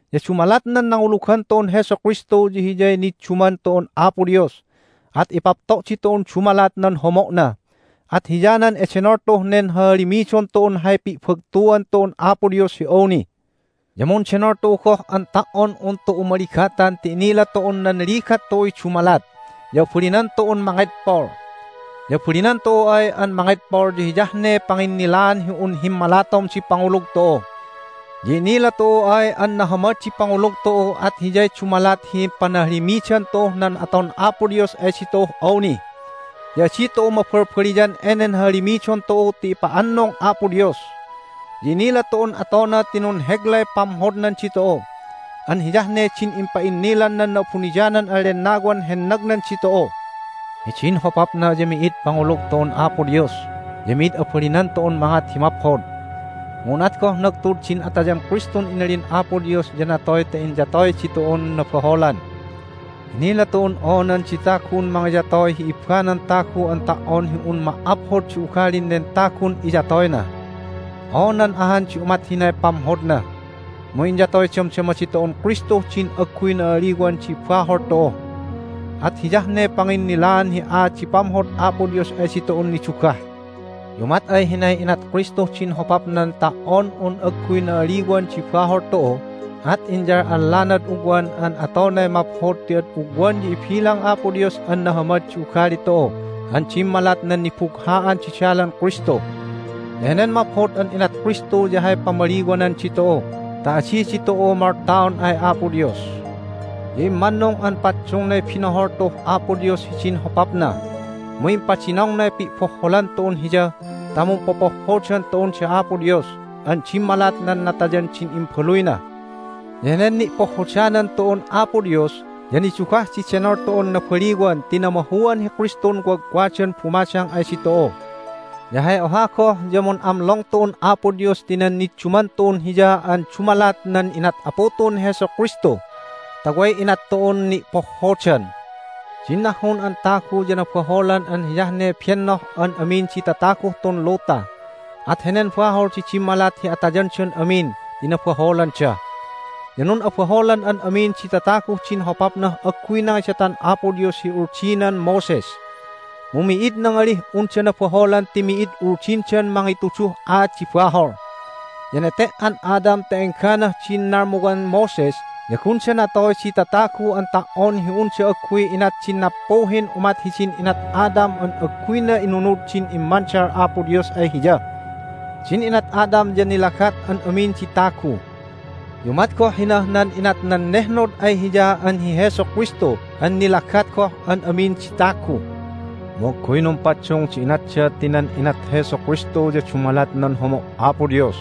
Ya dumalat nan nangulugan tu'un Jesu Kristu ya hiyay nidduman tu'un Apo Dios, at ipapto' ditu'un dumalat nan homo'na. At hiyanan edenol tu'uh nen hahalimidon tu'un hay pi'bagtuan tu'un Apo Dios hi awni! Ya mundenol tu'u goh an ta"on un tu'u maligatan ti inila tu'un nan ligat tu'uy dumalat, ya abalinan tu'un mangedpol. Ya abalinan tu'u ay an mangedpol ya hiyah ne panginnilaan hi un himmalatom di pangulug tu'u. Ya inila tu'u ay an nahamad di pangulug tu'u at hiyay dumalat hi panahalimidan tu'uh nan aton Apo Dios ay ditu'uh awni. Ya adi tu'u mabalbaliyan enen hahalimidon tu'u ti ipa'annung Apo Dios. Ya inila tu'un atona ti nunheglay pamhodnan ditu'u, an hiyah ne din impa'innilan nan Na'abuniyanan an Lennawan hennagnan ditu'u. Hidin hopapna ya mi'id pangulug tu'un Apo Dios, ya mi'id abalinan tu'un mangat hi maphod. Mu unat goh nagtud din atayan Kristun inalin Apo Dios ya natoy ta inyatoy ditu'un nabaholan. Inila tu'un oonan di tagun mangiyatoy hi ibbanan tagu an ta"on hi un ma"aphod di ugalin nen tagun iyatoyna. Oonan ahan di umat hinay pamhodna. Mu inyatoy damdama ditu'un Kristuh din agguy na'aliwan di bahol tu'u, at hiyah ne panginnilaan hi aat di pamhod Apo Dios ay ditu'un nidugah! Ya umat ay hinay inat Kristuh din hopapnan ta"on un agguy na'aliwan di bahol tu'u at inyal'allanad ugwan an atonay maphod ti ad ugwan ya ibilang Apo Dios an nahamad di ugali tu'u an dimmalat nan nibugha'an di dalan Kristu. Ya henen maphod an inat Kristu ya hay pamaliwanan ditu'u ta adi ditu'u moltaon ay Apo Dios. Ya immannung an paddungnay binohol tu'uh Apo Dios hidin hopapna, mu impadinongnay pi'bohholan tu'un Hiya ta mumpopohhodan tu'un da Apo Dios an dimmalat nan natayan din Imbaluyna. Ya henen ni'pohhodanan tu'un Apo Dios ya nidugah di denol tu'un nabaliwan ti namahuan hi Kristun wagwagdan bumadang ay ditu'u! Ya hay oha goh ya mun'amlong tu'un Apo Dios ti nan nidduman tu'un Hiya an dumalat nan inat Apu tu'un hi Jesu Kristu ta way inat tu'un ni'pohhodan. Din nahhun an tagu ya nabaholan an hiyah ne bennoh an amin di tataguh tun luta. At henen bahol di dimmalat hi atayandan amin ti nabaholanda. Ya nun'abaholan an amin di tataguh din hopapnah agguy nangidatan Apo Dios hi Uldinan Moses. Mu mi'id nangalih unda nabaholan ti mi'id Uldindan mangituduh aat di bahol. Ya nete"an Adam ta engganah din nalmuwan Moses ya gunda natoy di tatagu an ta"on hi unda agguy inat din nappuhin umat hidin inat Adam an agguyna inunud din immandal Apo Dios ay hiya. Din inat Adam ya nilagat an amin di tagu. Ya umat goh hinah nan inat nan nehnod ay hiya an hi Jesu Kristu an nilagat goh an amin di tagu. Mu agguy numpaddung di inatda ti nan inat Jesu Kristu ya dumalat nan homo' Apo Dios,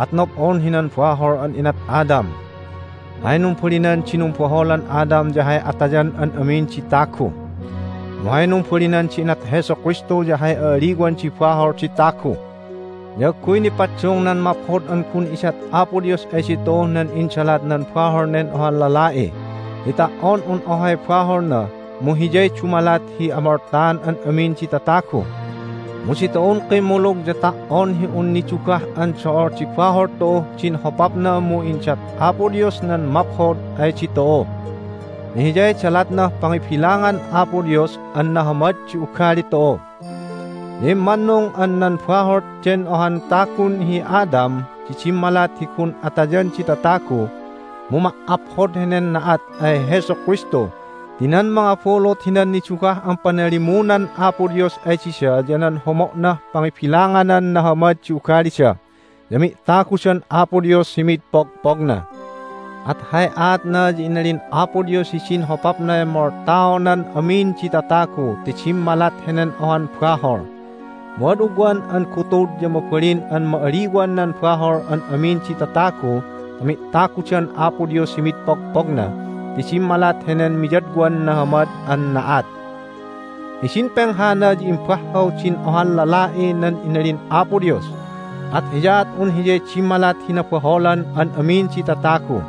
at nob'on hinan bahol an inat Adam. Hay numbalinan di numbaholan Adam ya hay atayan an amin di tagu. Mu hay numbalinan di inat Jesu Kristu ya hay a'aliwan di bahol di tagu. Ya agguy nipaddung nan maphod an gun idat Apo Dios ay ditu'uh nan indalat nan bahol nen ohan lala'i, ti ta"on un ohay baholna mu hiyay dumalat hi amoltaan an amin di tatagu. Mu ditu'un kimmulug ya ta"on hi un nidugah an do'ol di bahol tu'uh din hopapna mu indat Apo Dios nan maphod ay ditu'u, ya Hiyay dalatnah pangibilangan Apo Dios an nahamad di ugali tu'u! Ya immannung an nan bahol den ohan tagun hi Adam di dimmalat hi gun atayan di tatagu, mu ma"aphod henen na'at ay Jesu Kristu ti nan mangabulut hinan nidugah an panalimunan Apo Dios ay dida ya nan homo'nah pangibilanganan nahamad di ugalida, ya mi'tagudan Apo Dios hi mid pogpogna. At hay aatna ya inalin Apo Dios hidin hopapnay moltaonan amin di tatagu ti dimmalat henen ohan bahol. Mu ad ugwan an gutud ya mabalin an ma'aliwan nan bahol an amin di tatagu ta mi'tagudan Apo Dios hi mid pogpogna ti dimmalat henen miyadwan nahamad an na'at. Hidin penghana ya imbahhaw din ohan lala'i nan inalin Apo Dios, at hiyaat un hiyay dimmalat hi nabaholan an amin di tatagu.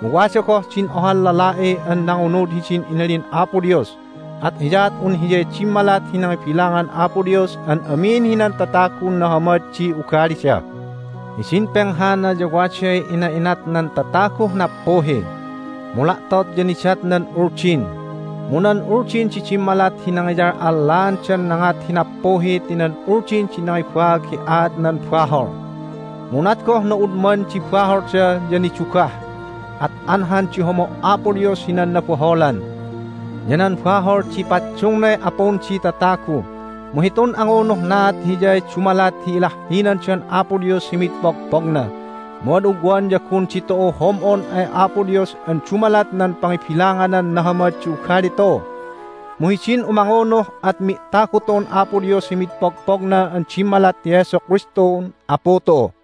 Mu wada goh din ohan lala'i an nangunud hidin inalin Apo Dios, at hiyaat un Hiyay dimmalat hi nangibilangan Apo Dios an amin hinan tatagun nahamad di ugalida. Hidin penghana ya waday ina'inat nan tataguh nappuhi, mu la'tot ya nidat nan Uldin. Mu nan Uldin di dimmalat hi nangiyal'allaandan nangat hi nappuhi ti nan Uldin di nangibaag hi aat nan bahol. Mu unat goh na'udman di baholda ya nidugah, at anhan di homo' Apo Dios hinan nabaholan. Ya nan bahol di paddungnay apun di tatagu, mu hitun angunuhnaat hiyay dumalat hi ilahhinandan Apo Dios hi mid pogpogna. Mu ad ugwan ya gun ditu'u hom'on ay Apo Dios an dumalat nan pangibilanganan nahamad di ugali tu'u. Mu hidin umangunuh at mi'tagu tu'un Apo Dios hi mid pogpogna an dimmalat hi Jesu Kristun Apu tu'u.